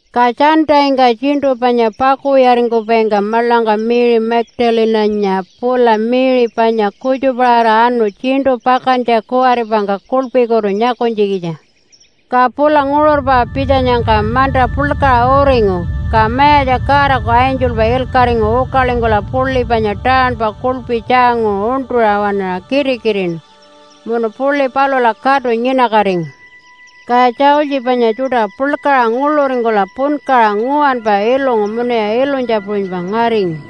Ka Sunday-ngka tjiṉṯu panya pakuwiyaringkupaingka maḻangka Mary Magdalene-anya pula Mary panya kutjupaṟara anu tjiṉṯu pakantja kuwaripangka kuḻpikutu nyakunytjikitja. Ka pula nguṟurpa pitjanyangka manta puḻkaṟa uringu, ka Mayatja Godaku angelpa ilkaṟinguṟu ukalingkula puḻi panya taaṉpa kuḻpi tjaanguṟu uṉṯuṟa waṉaṟa kitikitiṉu munu puḻi palula katu nyinakatingu. Kaya tjaultji panya tjuṯa puḻkaṟa nguḻuringkula punkaṟa nguwanpa ilungu munuya ilunytja puṟunypa ngaringi.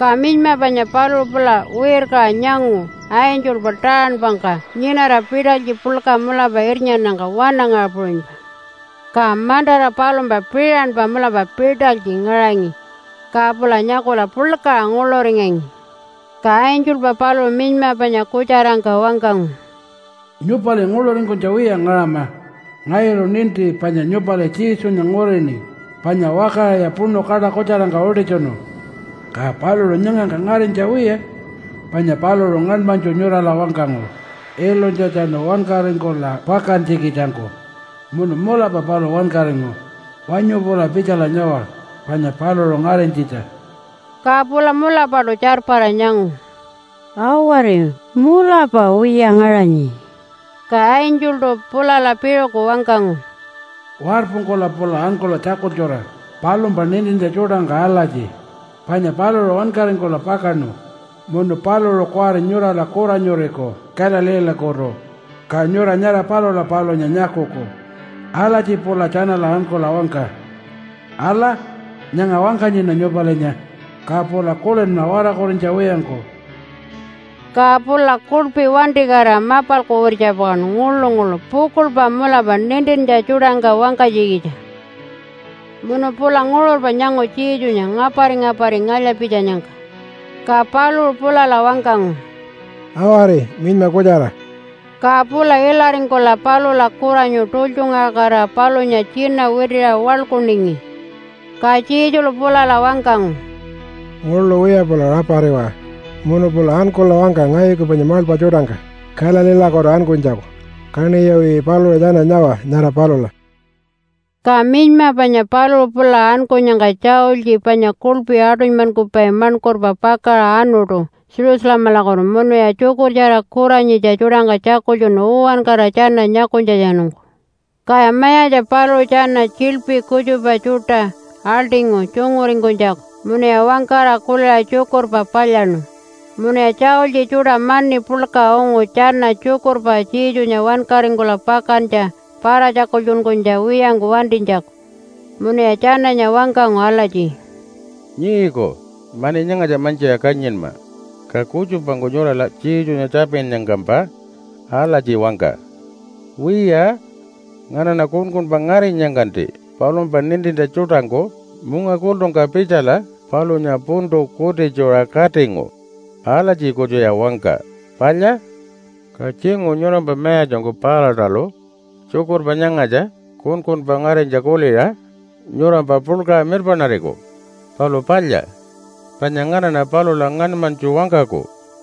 Ka minyma panya paluṟu pula wirkaṟa nyangu angelpa taaṉpangka nyinara pitalytji puḻka mulapa irnyannyangka wanangaṟa puṟunypa. Ka mantara palumpa piṟanpa mulapa pitalytji ngaṟangi. Ka pula nyakula puḻkaṟa nguḻuringangi. Ka angelpa paluṟu minyma panya kutjarangka wangkangu, “Nyupali nguḻuringkunytja wiya ngaṟama! Ngayulu ninti panya nyupali Jesunya ngurini, panya wakaṟaya puṉu kaṯakutjarangka utitjunu. Ka paluṟu nyangangka ngarinytja wiya, panya paluṟu ngaṉmanytju nyurala wangkangu ilunytjatjanu wankaringkula pakantjikitjangku, munu mulapa paluṟu wankaringu. Wanyu pula pitjala nyawa panya paluṟu ngarinytjitja.” Ka pula mulapaṯu tjarpara nyangu, “Awari! Mulapa wiya ngaṟanyi.” Ka angeltu pulala piṟuku wangkangu, “Warpungkula pula ankula tjakultjura palumpa nintintja tjuṯangka alatji, ‘Panya paluṟu wankaringkula pakaṉu, munu paluṟu kuwari nyurala kuranyuriku Galileelakutu, ka nyura nyara palula palunya nyakuku.’ Alatji pula tjanala ankula wangka! Ala! Nyanga wangkanyiṉa nyupalinya, ka pula kulinma watarkurinytja wiyangku.” Ka pula kuḻpi wantikatira mapalku wirtjapakaṉu nguḻu-nguḻu pukuḻpa mulapa nintintja tjuṯangka wangkanytjikitja. Munu pula nguṟurpa nyangu Jesunya ngapari-ngapari ngalya-pitjanyangka. Ka paluṟu pulala wangkangu, “Awari! Minyma kutjara!” Ka pula ilaringkula palula kuranyu tultjungaṟakatira palunya tjina witiṟa waḻkuningi. Ka Jesulu pulala wangkangu, “Nguḻu wiya pula rapariwa, munu pula ankula wangka ngayuku panya maḻpa tjuṯangka Galileelakutu ankunytjaku, kaṉiyawi paluṟu tjana nyawa nyara palula.” Ka minyma panya paluṟu pula ankunyangka tjaultji panya kuḻpi aṯunymankupai maṉkurpa pakaṟa anuṯu Jerusalemalakutu munuya tjukurtjara kuranyitja tjuṯangka tjakultjunu uwankara tjana nyakunytjatjanungku. Kaya mayatja paluṟu tjana tjiḻpi kutjupa tjuṯa aḻṯingu tjunguringkunytjaku munuya wangkara kuliṟa tjukurpa palyaṉu, munuya tjaultji tjuṯa mani puḻka ungu tjana tjukurpa Jesunya wankaringkula pakantja para-tjakultjunkunytja wiyangku wantinytjaku. Munuya tjananya wangkangu alatji, “Nyiiku! Mani nyangatja mantjiṟa kanyinma, ka kutjupangku nyurala Jesunya tjapinnyangkampa alatji wangka, ‘Wiya, nganaṉa kunkunpa ngarinyangkanti palumpa nintintja tjuṯangku munga kultungka pitjala palunya puntu kutitjuṟa katingu.’ Alatji kutjuya wangka, palya! Ka tjinguṟu nyurampa mayatjangku Pilate-alu tjukurpa nyangatja kunkunpa ngarinytja kuliṟa nyurampa puḻkaṟa mirpaṉariku, palu palya, panya nganaṉa palula ngaṉmanytju wangkaku,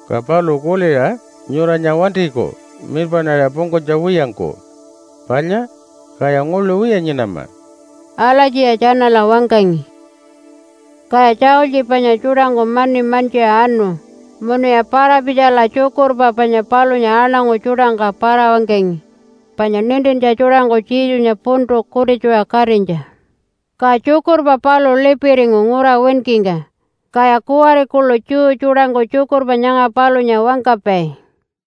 ka paluṟu kuliṟa nyuranya wantiku mirpaṉarira pungkunytja wiyangku, palya! Kaya nguḻu wiya nyinama!” Alatjiya tjanala wangkangi. Kaya tjaultji panya tjuṯangku mani mantjiṟa anu munuya para-pitjala tjukurpa panya palunya aṉangu tjuṯangka para-wangkangi, panya nintintja tjuṯangku Jesunya puntu kutitjuṟa katinytja. Ka tjukurpa paluṟu lipiringu ngura winkingka, kaya kuwari kuḻu Jew tjuṯangku tjukurpa nyanga palunya wangkapai.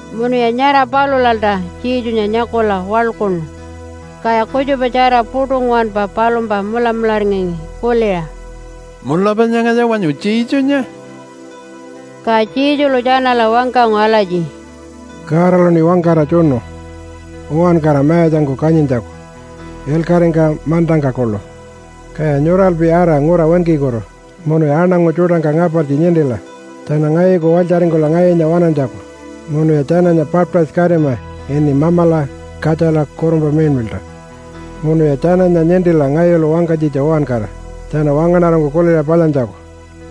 Munuya nyara palulalta Jesunya nyakula waḻkuṉu. Kaya kutjupatjara puṯu nguwanpa palumpa mulamularingangi kuliṟa, “Mulapa nyangatja wanyu Jesunya?” Ka Jesulu tjanala wangkangu alatji, “Godaluṉi wangkara tjunu uwankara mayatjangku kanyintjaku ilkaṟingka mantangka kuḻu. Kaya nyuralpi ara ngura winkikutu munuya aṉangu tjuṯangka ngapartji nintila tjana ngayuku walytjaringkula ngayunya waṉantjaku, munuya tjananya baptise-katima ini Mamala, Katjala, Kurunpa Miḻmiḻṯa. Munuya tjananya nintila ngayulu wangkanytjitja uwankara tjana wangaṉarangku kuliṟa palyantjaku.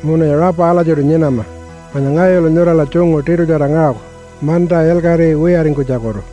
Munuya rapa alatjiṯu nyinama panya ngayulu nyurala tjungu tiṯutjara ngaṟaku manta ilkaṟi wiyaringkunytja-kutu.”